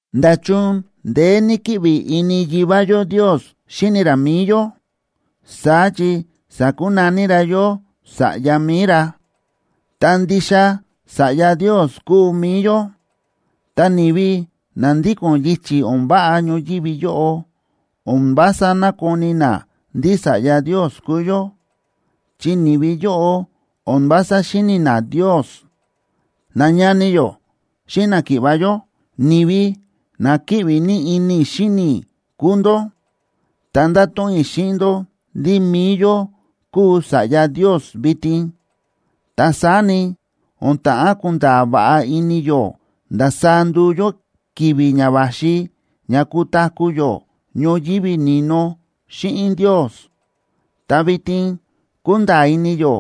¡Nda̱chun ndeé ní kíꞌvi ini Yivá yó Ndios xíni ra mi̱i yó! Saá chi sákunaní ra yó sa̱ꞌya mi̱i ra. Ta, ¡ndixa sa̱ꞌya Ndios kúu mi̱i yó! Ta ni̱vi na ndíko̱n yichi̱ o̱n váꞌa ñoyívi yóꞌo, o̱n vása nákoni na ndí sa̱ꞌya Ndios kúu yó, chi ni̱vi yóꞌo o̱n vása xíni̱ na Ndios. Nañani yó xíꞌin náki̱ꞌva̱ yó, ni̱vi na kíꞌvi ní ini i̱ xíni i̱ kúu ndó, ta ndáto̱ꞌon i̱ xíꞌin ndó ndí mi̱i yó kúu sa̱ꞌya Ndios vitin. Ta saá ni, o̱n ta̱ꞌán kunda̱a̱ va̱ꞌa ini yó ndasaá nduu yó ki̱vi̱ ña va̱xi ña kutaku̱ yó ñoyívi ni̱no xíꞌin Ndios. Ta vitin kúnda̱a̱ ini yó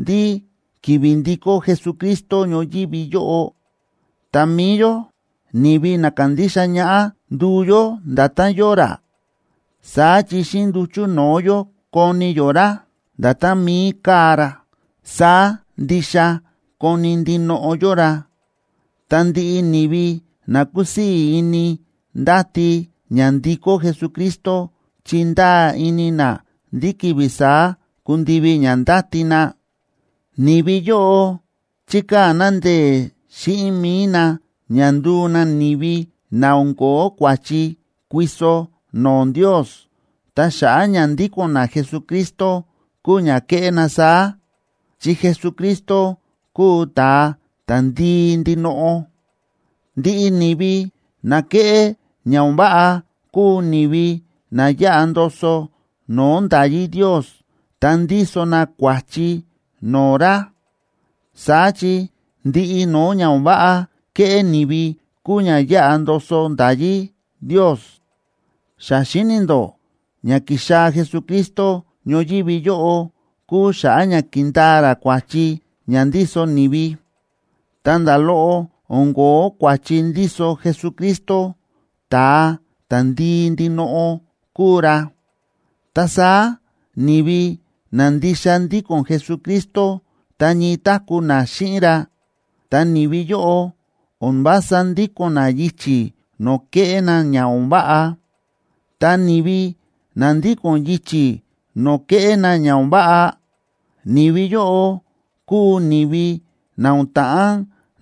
ndí ki̱vi̱ ndikó Jesucristo ñoyívi yóꞌo, ta mi̱i yó, ni̱vi na kándixa ñaꞌá, nduu yó nda̱tán yóo ra. Saá chi xíꞌin nduchu̱ no̱o̱ yó koni yó ra. Nda̱tán mi̱i káa ra, saá ndixa koni ndinoꞌo yó ra. Ta ndiꞌi ni̱vi na kúsii̱ ini ndáti ña ndikó Jesucristo, chi ndáa ini na ndí ki̱vi̱ saá kundivi ña ndáti na, ni̱vi yóꞌo chíkaa̱ na ndee̱ xíꞌin mi̱i na ña nduu na ni̱vi na o̱n ko̱ó kua̱chi kuiso no̱o̱ Ndios. Ta xa̱ꞌa̱ ña ndíko̱n na Jesucristo kúu ña kéꞌé na saá, chi Jesucristo kúu ta̱a ta̱ndii ndinoꞌo. Ndiꞌi ni̱vi na kéꞌé ña o̱n váꞌa kúu ni̱vi na yáꞌa ndoso no̱o̱ nda̱yí Ndios ta ndíso na kua̱chi no̱o̱ ra. Saá chi ndiꞌi no̱o̱ ña o̱n váꞌa kéꞌé ni̱vi kúu ña yáꞌa ndoso nda̱yí Ndios. Xa xíni̱ ndó ña ki̱xaa̱ Jesucristo ñoyívi yóꞌo kúu xa̱ꞌa̱ ña kindaa ra kua̱chi ña ndíso ni̱vi. Ta nda̱ loꞌo o̱n ko̱ó kua̱chi ndíso Jesucristo, ta̱a ta̱ndii ndinoꞌo kúu ra. Ta saá ni̱vi na ndixa ndíko̱n Jesucristo, tá ñii táku̱ na xíꞌin ra, ta ni̱vi yóꞌo o̱n vása ndíko̱n na yichi̱ no̱o̱ kéꞌé na ña o̱n váꞌa. Ta ni̱vi na ndíko̱n yichi̱ no̱o̱ kéꞌé na ña o̱n váꞌa, ni̱vi yóꞌo kúu ni̱vi na o̱n ta̱ꞌán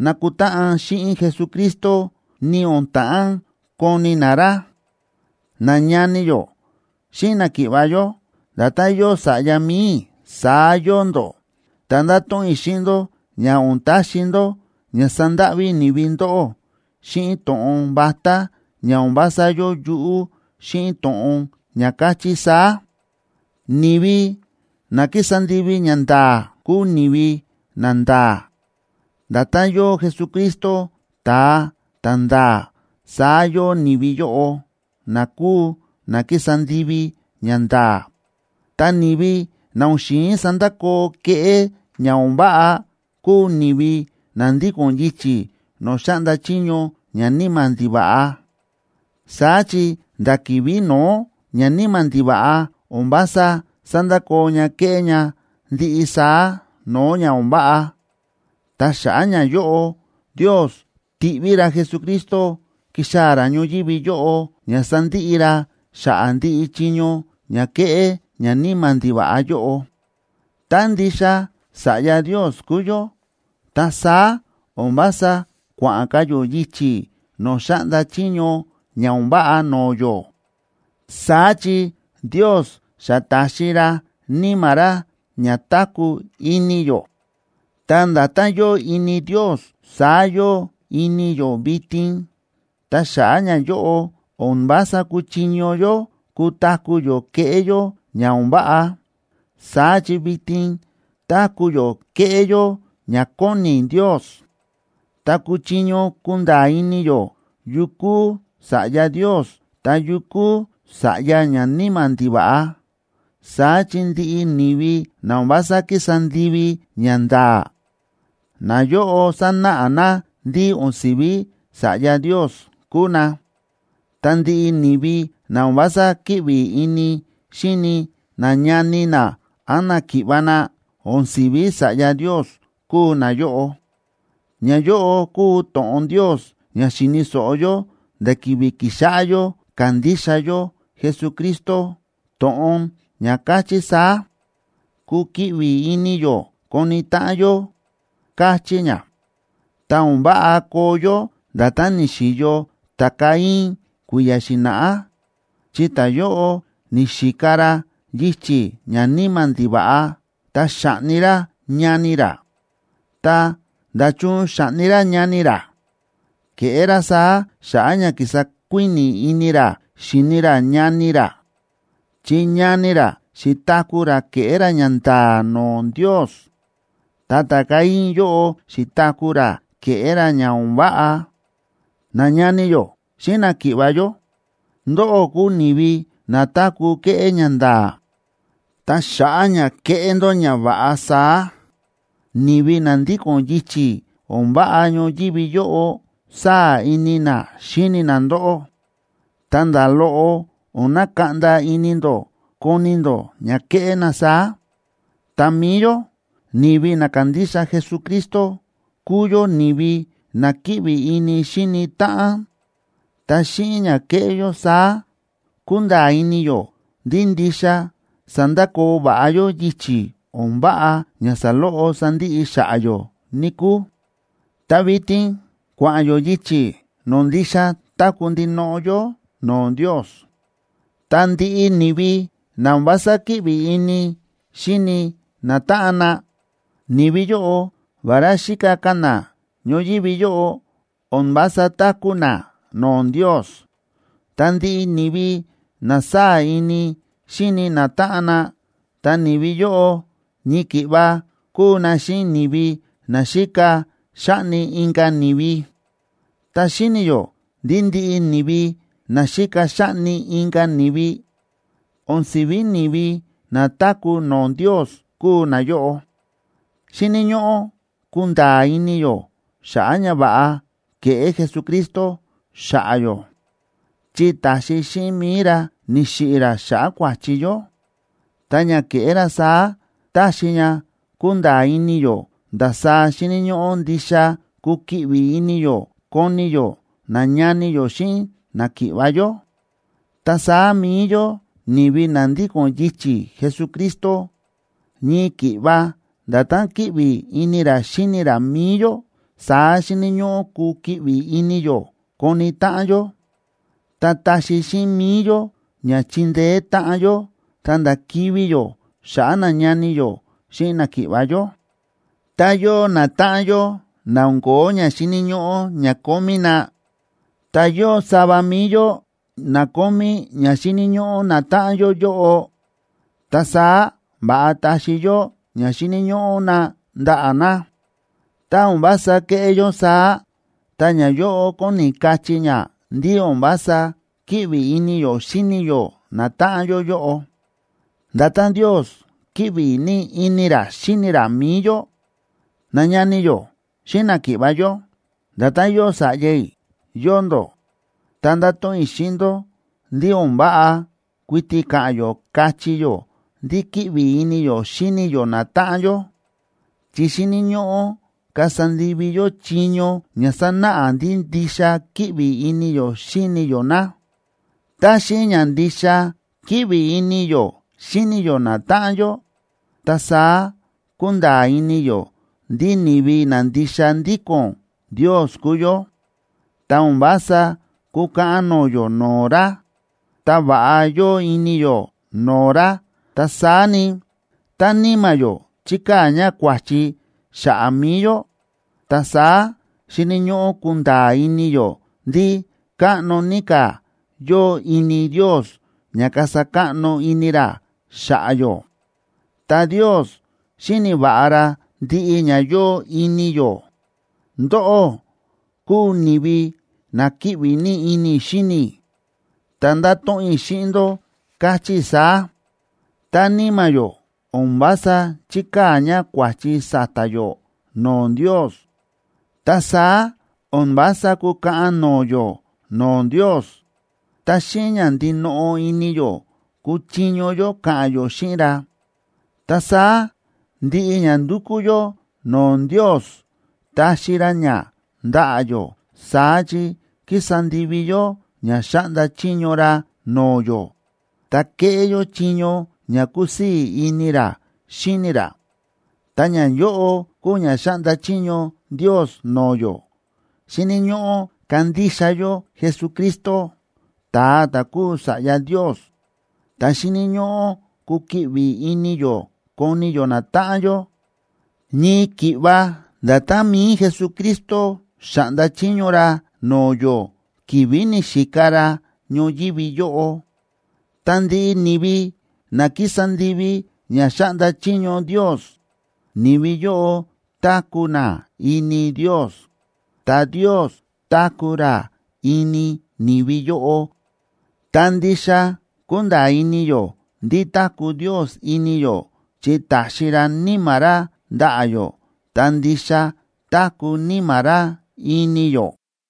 nakutáꞌan xíꞌin Jesucristo, ni o̱n ta̱ꞌán koni na ra. Nañani yó xíꞌin náki̱ꞌva̱ yó, nda̱tán yóo sa̱ꞌya mi̱i i̱, saá yóo ndó, ta ndáto̱ꞌon i̱ xíꞌin ndó ña o̱n taxi ndó ña sandáꞌví ni̱vi ndóꞌó xíꞌin to̱ꞌon vatá ña o̱n vása yóo yuꞌú xíꞌin to̱ꞌon ña káchí saá: Ni̱vi na kísa ndivi ñanda̱a̱ kúu ni̱vi nanda̱a̱. Nda̱tán yóo Jesucristo ta̱a ta̱nda̱a̱, saá yóo ni̱vi yóꞌo, na kúu na kísa ndivi ñanda̱a̱. Ta ni̱vi na o̱n xi̱in sandakoo keꞌé ña o̱n váꞌa kúu ni̱vi na ndíko̱n yichi̱ no̱o̱ xáꞌnda chiño ñaníma̱ ndiva̱ꞌa, saá chi nda̱ ki̱vi̱ no̱ó ñaníma̱ ndiva̱ꞌa o̱n vása sandakoo ña kéꞌé ña ndiꞌi saá no̱o̱ ña o̱n váꞌa. Ta xa̱ꞌa̱ ñayóꞌo Ndios ti̱ꞌví ra Jesucristo ki̱xaa̱ ra ñoyívi yóꞌo ña sandiꞌi ra xa̱ꞌa̱ ndiꞌi chiño ña kéꞌé ñaníma̱ ndiva̱ꞌa yóꞌo. Tá ndixa sa̱ꞌya Ndios kúu yó, ta saá o̱n vása kua̱ꞌa̱n ka̱ yó yichi̱ no̱o̱ xáꞌnda chiño ña o̱n váꞌa no̱o̱ yó, saá chi Ndios xa ta̱xi ra Níma̱ ra ña táku̱ ini yó, ta nda̱tán yóo ini Ndios saá yóo ini yó vitin. Ta xa̱ꞌa̱ ñayóꞌo, o̱n vása kúchiño yó kutaku̱ yó kéꞌé yó ña o̱n váꞌa. Saá chi vitin táku̱ yó kéꞌé yó ña kóni Ndios. Ta kúchiño kunda̱a̱ ini yó yu kúu sa̱ꞌya Ndios ta yu kúu sa̱ꞌya ñaníma̱ ndiva̱ꞌa. Saá chi ndiꞌi ni̱vi na o̱n vása kísa ndivi ñanda̱a̱, nayóꞌo sánáꞌa na ndí o̱n si̱ví sa̱ꞌya Ndios kúu na. Ta ndiꞌi ni̱vi na o̱n vása kíꞌvi ini xíni nañani na án náki̱ꞌva̱ na, o̱n si̱ví sa̱ꞌya Ndios kúu nayóꞌo. Ñayóꞌo kúu to̱ꞌon Ndios ña xi̱ni̱ so̱ꞌo yó nda̱ ki̱vi̱ ki̱xáꞌá yó kándixa yó Jesucristo, to̱ꞌon ña káchí saá: Kukiꞌvi ini yó koni táꞌan yó, káchí ña. Ta o̱n váꞌa koo yó nda̱tán ni̱xi̱yo ta̱Caín kui̱ya̱ xi̱na̱ꞌá, chi ta̱yóꞌo ni̱xika ra yichi̱ ñaníma̱ ndiva̱ꞌa, ta xa̱ꞌni ra ñani ra. Ta, ¿nda̱chun xa̱ꞌni ra ñani ra? Ke̱ꞌé ra saá xa̱ꞌa̱ ña ki̱sa kuíni̱ ini ra xíni ra ñani ra, chi ñani ra xi̱taku̱ ra kéꞌé ra ñanda̱a̱ no̱o̱ Ndios, ta ta̱Caín yóꞌo xi̱taku̱ ra kéꞌé ra ña o̱n váꞌa. Nañani yó xíꞌin náki̱ꞌva̱ yó, ndóꞌó kúu ni̱vi na táku̱ kéꞌé ñanda̱a̱. Ta xa̱ꞌa̱ ña kéꞌé ndó ñava̱ꞌa saá, ni̱vi na ndíko̱n yichi̱ o̱n váꞌa ñoyívi yóꞌo sáa̱ ini na xíni na ndóꞌó. Ta nda̱ loꞌo o̱n nakaꞌnda ini ndó koni ndó ña kéꞌé na saá. Ta mi̱i yó, ni̱vi na kándixa Jesucristo, kúu yó ni̱vi na kíꞌvi ini xíni táꞌan. Ta xíꞌin ña kéꞌé yó saá kúnda̱a̱ ini yó ndí ndixa sa̱ndakoo va̱ꞌa yó yichi̱ o̱n váꞌa ña saloꞌo sandiꞌi xa̱ꞌa̱ yó, níkúu, ta vitin kua̱ꞌa̱n yó yichi̱ no̱o̱ ndixa táku̱ ndinoꞌo yó no̱o̱ Ndios. Ta ndiꞌi ni̱vi na o̱n vása kíꞌvi ini xíni natáꞌan na, ni̱vi yóꞌo, vará xíka ka̱ na ñoyívi yóꞌo, o̱n vása táku̱ na no̱o̱ Ndios. Ta ndiꞌi ni̱vi na sáa̱ ini xíni natáꞌan na, ta ni̱vi yóꞌo ñii ki̱ꞌva kúu na xíꞌin ni̱vi na xíka xáꞌni inka̱ ni̱vi. Ta xíni̱ yó ndí ndiꞌi ni̱vi na xíka xáꞌni inka̱ ni̱vi, o̱n si̱ví ni̱vi na táku̱ no̱o̱ Ndios kúu nayóꞌo. Xíni̱ ñóꞌó kunda̱a̱ ini yó xa̱ꞌa̱ ñava̱ꞌa ke̱ꞌé Jesucristo xa̱ꞌa̱ yó, chi ta̱xi xíꞌin mi̱i ra ni̱xiꞌi̱ ra xa̱ꞌa̱ kua̱chi yó. Ta ña ke̱ꞌé ra saá táxi ña kunda̱a̱ ini yó ndasaá xíni̱ ñóꞌó ndixa kukiꞌvi ini yó koni yó nañani yó xíꞌin náki̱ꞌva̱ yó. Ta saá mi̱i yó ni̱vi na ndíko̱n yichi̱ Jesucristo, ñii ki̱ꞌva nda̱tán kíꞌvi ini ra xíni ra mi̱i yó, saá xíni̱ ñóꞌó kukiꞌvi ini yó koni táꞌan yó, ta taxi xíꞌin mi̱i yó ña chindeé táꞌan yó ta̱nda̱ kivi̱ yó xa̱ꞌa̱ nañani yó xíꞌin náki̱ꞌva̱ yó. Tá yóo natáꞌan yó na o̱n ko̱ó ña xíni̱ ñóꞌó ña kómí na, ta yóo sava mi̱i yó na kómí ña xíni̱ ñóꞌó natáꞌan yó yóꞌo, ta saá va̱ꞌa taxi yó ña xíni̱ ñóꞌó na ndaꞌa̱ na. Tá o̱n vása kéꞌé yó saá, ta ñayóꞌo kóni kachí ña ndí o̱n vása kíꞌvi ini yó xíni yó natáꞌan yó yóꞌo, nda̱tán Ndios kíꞌvi ní ini ra xíni ra mi̱i yó. Nañani yó xíꞌin náki̱ꞌva̱ yó, nda̱tán yóo sa̱ꞌya i̱ yóo ndó, ta ndáto̱ꞌon i̱ xíꞌin ndó ndí o̱n váꞌa kuiti ka̱ꞌa̱n yó kachí yó ndí kíꞌvi ini yó xíni yó natáꞌan yó, chi xíni̱ ñóꞌó kasa ndivi yó chiño ña sánáꞌa ndí ndixa kíꞌvi ini yó xíni yó na. Tá xíꞌin ña ndixa kíꞌvi ini yó xíni yó natáꞌan yó, ta saá kúnda̱a̱ ini yó ndí ni̱vi na ndixa ndíko̱n Ndios kúu yó, ta o̱n vása kúkaꞌan no̱o̱ yó no̱o̱ ra, ta va̱ꞌa yóo ini yó no̱o̱ ra. Ta saá ni, tá níma̱ yó chíkaa̱ ña kua̱chi xa̱ꞌa̱ mi̱i yó, ta saá xíni̱ ñóꞌó kunda̱a̱ ini yó ndí káꞌno ní ka̱ yóo ini Ndios ña kasa káꞌno ini ra xa̱ꞌa̱ yó, ta Ndios xíni̱ va̱ꞌa ra ndiꞌi ña yóo ini yó. Ndóꞌó kúu ni̱vi na kíꞌvi ní ini i̱ xíni i̱, ta ndáto̱ꞌon i̱ xíꞌin ndó, káchí i̱ saá: Tá níma̱ yó o̱n vása chíkaa̱ ña kua̱chi sa̱ta̱ yó no̱o̱ Ndios, ta saá o̱n vása kúkaꞌan no̱o̱ yó no̱o̱ Ndios, ta xíꞌin ña ndinoꞌo ini yó kuchiño yó ka̱ꞌa̱n yó xíꞌin ra. Ta saá ndiꞌi ña ndúkú yó no̱o̱ Ndios, taxi ra ña ndaꞌa̱ yó, saá chi kísa ndivi yó ña xáꞌnda chiño ra no̱o̱ yó, ta kéꞌé yó chiño ña kúsii̱ ini ra xíni ra. Ta ñayóꞌo kúu ña xáꞌnda chiño Ndios no̱o̱ yó: Xíni̱ ñóꞌó kandixa yó Jesucristo, ta̱a ta̱ kúu Sa̱ꞌya Ndios, ta xíni̱ ñóꞌó kukiꞌvi ini yó koni yó natáꞌan yó, ñii ki̱ꞌva nda̱tán mi̱i Jesucristo xa̱ꞌnda chiño ra no̱o̱ yó ki̱vi̱ ni̱xika ra ñoyívi yóꞌo. Ta ndiꞌi ni̱vi na kísa ndivi ña xáꞌnda chiño Ndios, ni̱vi yóꞌo táku̱ na ini Ndios ta Ndios táku̱ ra ini ni̱vi yóꞌo. Ta ndixa kúnda̱a̱ ini yó ndí táku̱ Ndios ini yó chi ta̱xi ra Níma̱ ra ndaꞌa̱ yó, ta ndixa táku̱ Níma̱ ra ini yó.